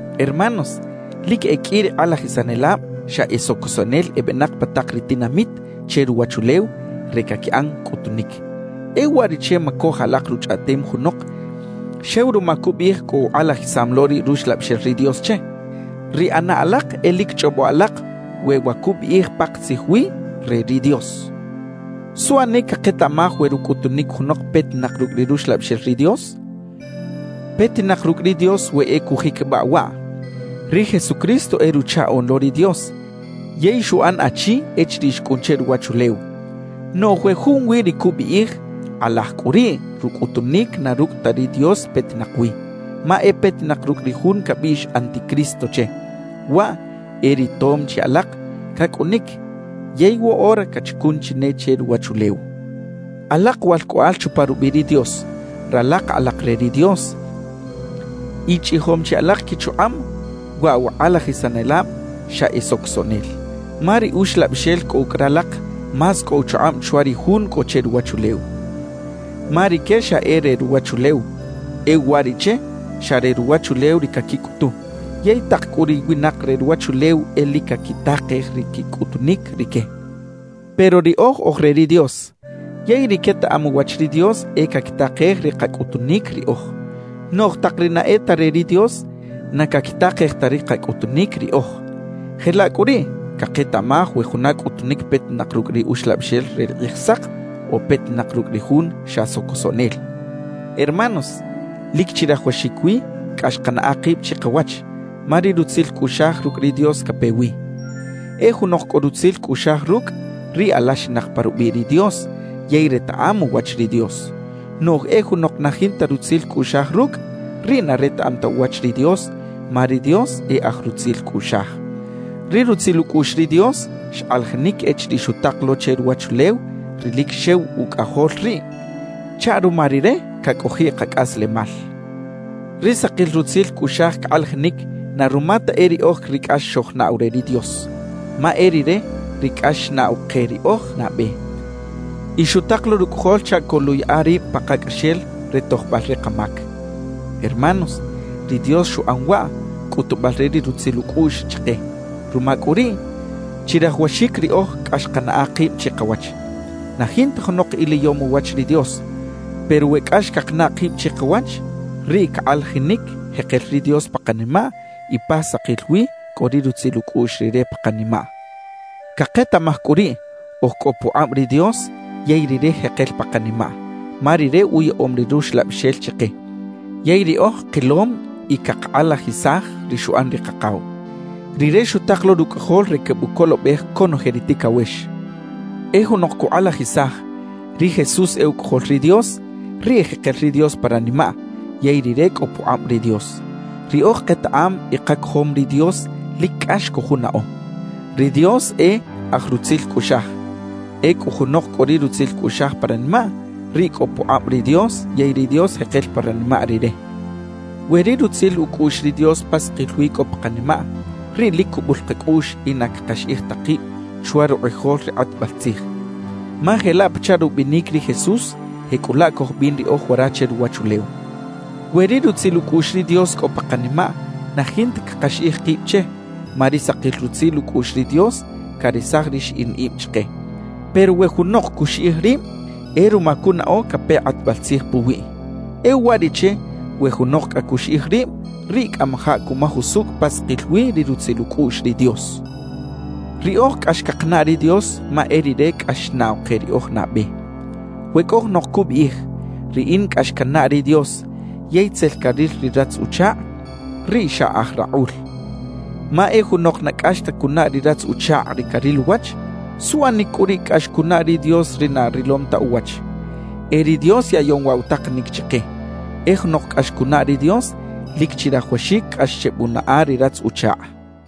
Hermanos, lic e qꞌui ri kꞌalajisanelab xa e socosoꞌnel ebenak pa tak ri tinamit che ruwachulew re caquiꞌan cꞌutunic. E uwariꞌche macoj alak ruchꞌaꞌtem junok xew ruma cubiꞌij cꞌo ukꞌalajisam lo ri Ruxlabixel ri Dios che. Ri ꞌana alak e lic chꞌobo alak we wa cubiꞌij pakatzij wi re ri Dios. ¿Suꞌanic caketaꞌmaj we rucꞌutunic junok petinak rucꞌ ri Ruxlabixel ri Dios? Petinak rucꞌ ri Dios we e cujiquibaꞌ waꞌ: «Ri Jesucristo e Ruchaꞌoꞌn lo ri Dios yey xuꞌan achi echiriꞌ xcꞌun che ruwachulew.» Noꞌj we junwi ri cubiꞌij, kꞌalaj cꞌu riꞌ rucꞌutunic na rucꞌ ta ri Dios petinak wi, ma e petinak rucꞌ ri jun cabiꞌx “anticristo” che; waꞌ e ri tom chi alak cacꞌunic yey woꞌora cachacun chi ne che ruwachulew. Alak walcꞌoꞌal chupa rubiꞌ ri Dios, ralak alak re ri Dios y chꞌijom chi alak quichukꞌab waꞌ wa kꞌalajisanelab xa e socosoꞌnel; ma ri Uxlabixel cꞌo ucꞌ ralak más cꞌo uchukꞌab chwa ri jun cꞌo che ruwachulew. Ma rique xa e re ruwachulew, e uwariꞌche xa re ruwachulew ri caquicꞌutu; yey tak cꞌu ri winak re ruwachulew e lic caquitakej ri quicꞌutunic rique. Pero riꞌoj oj re ri Dios, yey ri quetaꞌam uwach ri Dios e caquitakej ri kacꞌutunic riꞌoj, noꞌj tak ri na e ta re ri Dios na caquitakej ta ri kacꞌutunic riꞌoj. Jelaꞌ cꞌu riꞌ caketaꞌmaj we juna cꞌutunic petinak rucꞌ ri Uxlabixel re ri Kꞌijsak o petinak rucꞌ ri jun xa socosoꞌnel. Hermanos, lic chirajawaxic wi cꞌax kanaꞌa kib chikawach, ma ri rutzil cꞌuꞌxaj rucꞌ ri Dios cape wi. E junok cꞌo rutzil cꞌuꞌxaj rucꞌ, riꞌ alaxinak pa rubiꞌ ri Dios yey retaꞌam uwach ri Dios; noꞌj e junok na jinta rutzil cꞌuꞌxaj rucꞌ, riꞌ na retaꞌam ta uwach ri Dios, ma ri Dios e aj rutzil cꞌuꞌxaj. Ri rutzil ucꞌuꞌx ri Dios xkꞌalajinic echiriꞌ xutak lo che ruwachulew ri lic xew Ucꞌajol riꞌ, chaꞌ ruma Rire cacꞌojiꞌ kacꞌaslemal. Ri sakil rutzil cꞌuꞌxaj cakꞌalajinic na ruma ta e riꞌoj ri cꞌax xojnaꞌw re ri Dios, ma e Rire ri cꞌax xnaꞌw ke riꞌoj nabe y xutak lo Rucꞌajol chaꞌ coluꞌyaꞌa rib pakacꞌaxel re tojbal ri kamac. Hermanos, ri Dios xuꞌan waꞌ, cꞌutubal re ri rutzil ucꞌuꞌx chike; ruma cꞌu riꞌ chirajawaxic riꞌoj cꞌax kanaꞌa kib chikawach. Na jinta junok iliyom uwach ri Dios; pero we cꞌax cakanaꞌ kib chikawach, riꞌ cakꞌalajinic jekel ri Dios pa kanimaꞌ y pa sakil wi cꞌo ri rutzil ucꞌuꞌx Rire pa kanimaꞌ. Caketaꞌmaj cꞌu riꞌ, oj cꞌo pukꞌab ri Dios yey Rire jekel pa kanimaꞌ, ma Rire uyaꞌom ri Ruxlabixel chike. Yey riꞌoj kilom y cakakꞌalajisaj ri xuꞌan ri Kakaw: Rire xutak lo Rucꞌajol re quebucolobej conoje ri ticawex. E junok cukꞌalajisaj: «Ri Jesús e Ucꞌajol ri Dios», riꞌ jekel ri Dios pa ranimaꞌ yey rire cꞌo pukꞌab ri Dios. Riꞌoj ketaꞌam y kacojom ri Dios lic cꞌax cojunaꞌo. Ri Dios e aj rutzil cꞌuꞌxaj; ecꞌu junok cꞌo ri rutzil cꞌuꞌxaj pa ranimaꞌ, riꞌ cꞌo pukꞌab ri Dios yey ri Dios jekel pa ranimaꞌ rire. We ri rutzil ucꞌuꞌx ri Dios pa sakil wi cꞌo pa kanimaꞌ, riꞌ lic cubul kacꞌuꞌx y na cakaxiꞌij ta kib chwa rukꞌijol ri kꞌatbal tzij, ma jelaꞌ pachaꞌ rubinic ri Jesús, jecꞌulaꞌ cojbin riꞌoj wara che ruwachulew. We ri rutzil ucꞌuꞌx ri Dios cꞌo pa kanimaꞌ, na jinta cakaxiꞌij kib che, ma ri sakil rutzil ucꞌuꞌx ri Dios caresaj ri xiꞌin ib chike. Pero we junok cuxiꞌij rib, e ruma cunaꞌo cape kꞌatbal tzij puwiꞌ. E uwariꞌche we junok cꞌa cuxiꞌij rib, riꞌ cꞌamajaꞌ cumaj usucꞌ pa sakil wi ri rutzil ucꞌuꞌx ri Dios. Riꞌoj cꞌax cakanaꞌ ri Dios ma e Rire cꞌax xnaꞌw ke riꞌoj nabe. We cꞌo junok cubiꞌij: «Riꞌin cꞌax cannaꞌ ri Dios,» yey tzel caril ri ratz-uchakꞌ, riꞌ xa aj rakꞌul. Ma e junok na cꞌax ta cunaꞌ ri ratz-uchakꞌ ri caril uwach, ¿suꞌanic cꞌu riꞌ cꞌax cunaꞌ ri Dios ri na rilom ta uwach? E ri Dios yaꞌyom waꞌ wa takanic chike: «E junok cꞌax cunaꞌ ri Dios, lic chirajawaxic cꞌax chebunaꞌa ri ratz-uchakꞌ.»